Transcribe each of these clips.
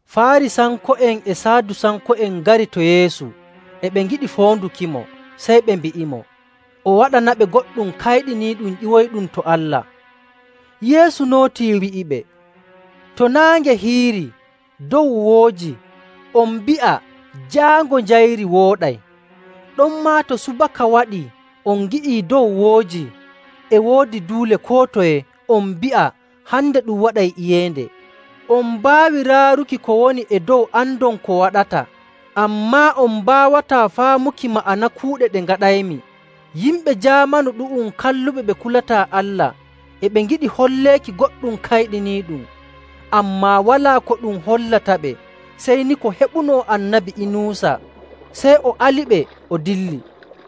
Faarisanko'en e Saadusanko'en ngari to Yeesu, e ɓe ngiɗi foondukimo, sey ɓe mbi'imo o waɗanaɓe goɗɗum kayɗiniiɗum ƴiwoyɗum to Allah.. Yeesu nootii, wi'iɓe, “To naange hiirii, dow woojii, on mbi'a, ‘Jaango njayri wooɗay.’ Ɗonmaa to subaka waɗii on ngi'ii dow woojii e woodi duule koo toye, on mbi'a, ‘Hande ɗum waɗay iyeende.’ On mbaawi raaruki ko woni e dow andon ko waɗata, ammaa on mbaawataa faamuki ma'ana kuuɗe ɗe ngaɗaymi. Yimɓe jaamanu ɗu'um kalluɓe ɓe kulataa Allah, e ɓe ngiɗi holleeki goɗɗum kayɗiniiɗum, ammaa walaa ko ɗum hollataɓe sey ni ko heɓuno Annabi Inuusa.”. Sey o aliɓe o dilli.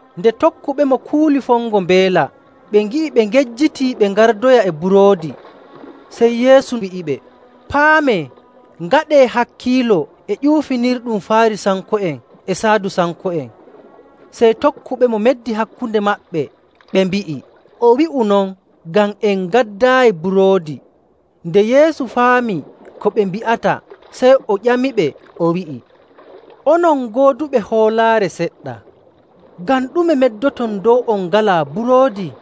Nde tokkuɓemo kuuli fongo mbeela, ɓe ngi'i ɓe ngejjitii ɓe ngardoya e buroodi. Sey Yeesu wi'iɓe, “Paamee, ngaɗee hakkiilo e ƴuufinirɗum Faarisanko'en e Saadusanko'en.”. Sey tokkuɓemo meddi hakkunde maɓɓe, ɓe mbi'i, “O wi'u non ngam en ngaddaayi buroodi.” Nde Yeesu faami ko ɓe mbi'ata, sey o ƴamiɓe, o wi'ii, “Onon gooduɓe hoolaare seɗɗa, ngam ɗume meddoton dow on ngalaa buroodi?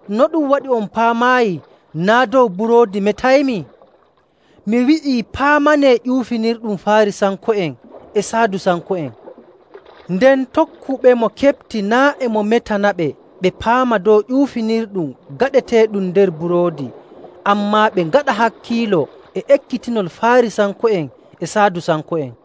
No ɗum waɗi on paamaayi naa' dow buroodi metaymi? Mi wi'ii paamanee ƴuufinirɗum Faarisanko'en e Saadusanko'en.” Nden tokkuɓemo keɓti naa' e mo metanaɓe ɓe paama dow ƴuufinirɗum gaɗeteeɗum nder buroodi, ammaa ɓe ngaɗa hakkiilo e ekkitinol Faarisanko'en e Saadusanko'en.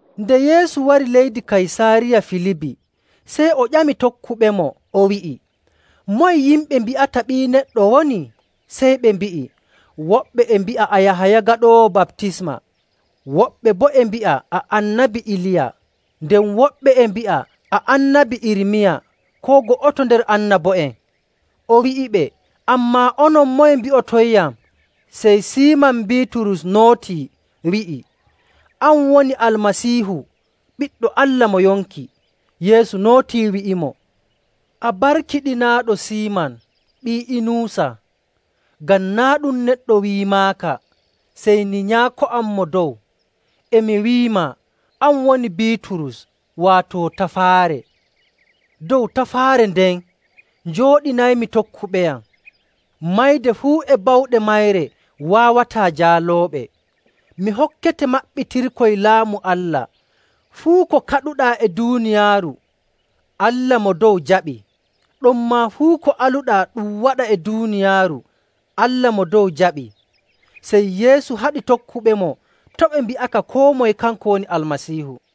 Nde Yeesu wari leydi Kaysaariya Filibi, sey o ƴami tokkuɓemo, o wi'i, “Moye yimɓe mbi'ata Ɓii Neɗɗo woni?” Sey ɓe mbi'i, “Woɓɓe e mbi'a a Yahaya Gaɗoowo Baptisma. Woɓɓe boo e mbi'a a Annabi Iliya. Nden woɓɓe e mbi'a a Annabi Irmiya koo go'oto nder annabo'en.”. O wi'iɓe, “Ammaa onon, moye mbi'otonyam?” Sey Siiman Biiturus nootii, wi'i, “An woni Almasiihu, Ɓiɗɗo Allah mo yonki.”. Yeesu nootii wi'imo, “A barkiɗinaaɗo, Siiman ɓii Inuusa, ngam naa' ɗum neɗɗo wi'imaaka, sey ni Nyaako am Mo Dow. E mi wi'imaa, an woni Biiturus, waato Tafaare. Dow tafaare nden njooɗinaymi tokkuɓeyam. Mayde fuu e bawɗe mayre waawataa jaalooɓe. Mi hokkete maɓɓitirkoy Laamu Allah, fuu ko kaɗuɗaa e duuniyaaru, Allah Mo Dow jaɓi. Ɗonmaa fuu ko aluɗaa ɗum waɗa e duuniyaaru, Allah Mo Dow jaɓii.”. Sey Yeesu haɗi tokkuɓemo to' ɓe mbi'aka koo moye kanko woni Almasiihu.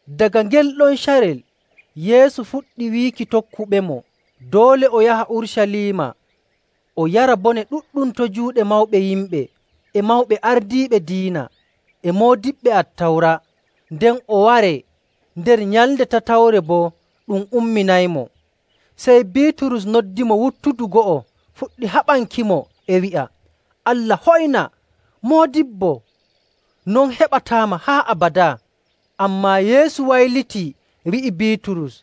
Daga ngel ɗon carel Yeesu fuɗɗi wiiki tokkuɓemo doole o yaha Urucaliima, o yara bone ɗuɗɗum to juuɗe mawɓe yimɓe, e mawɓe ardiiɓe diina, e moodiɓɓe Attawra, nden o waree. Nder nyalnde tatawre boo ɗum umminaymo. Sey Biiturus noddimo wuttudu go'o fuɗɗi haɓankimo, e wi'a, “Allah hoyna, Moodibbo! Non heɓataama haa abadaa!” Ammaa Yeesu waylitii, wi'i Biiturus,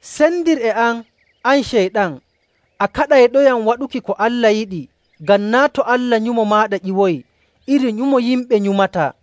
“Sendir e am, an Ceyɗan! A kaɗayɗoyam waɗuki ko Allah yiɗi, ngam naa' to Allah nyumo maaɗa ƴiwoyi, iri nyumo yimɓe nyumataa.”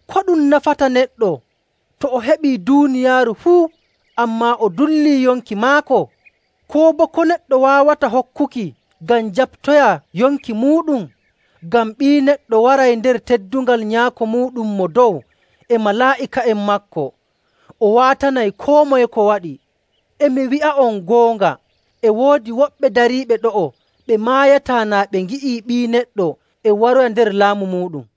Ko ɗum nafanta neɗɗo to o heɓii duuniyaaru fuu, ammaa dullii yonki maako? Koo boo ko neɗɗo waawata hokkuki ngam jaɓtoya yonki muuɗum? Ngam Ɓii Neɗɗo waray nder teddungal Nyaako muuɗum Mo Dow e malaa'ika'en maako, o waatanay koo moye ko waɗi.. E mi wi'a'on goonga, e woodi woɓɓe dariiɓe ɗo'o ɓe maayataa naa ɓe ngi'ii Ɓii Neɗɗo e waroya nder laamu muuɗum.”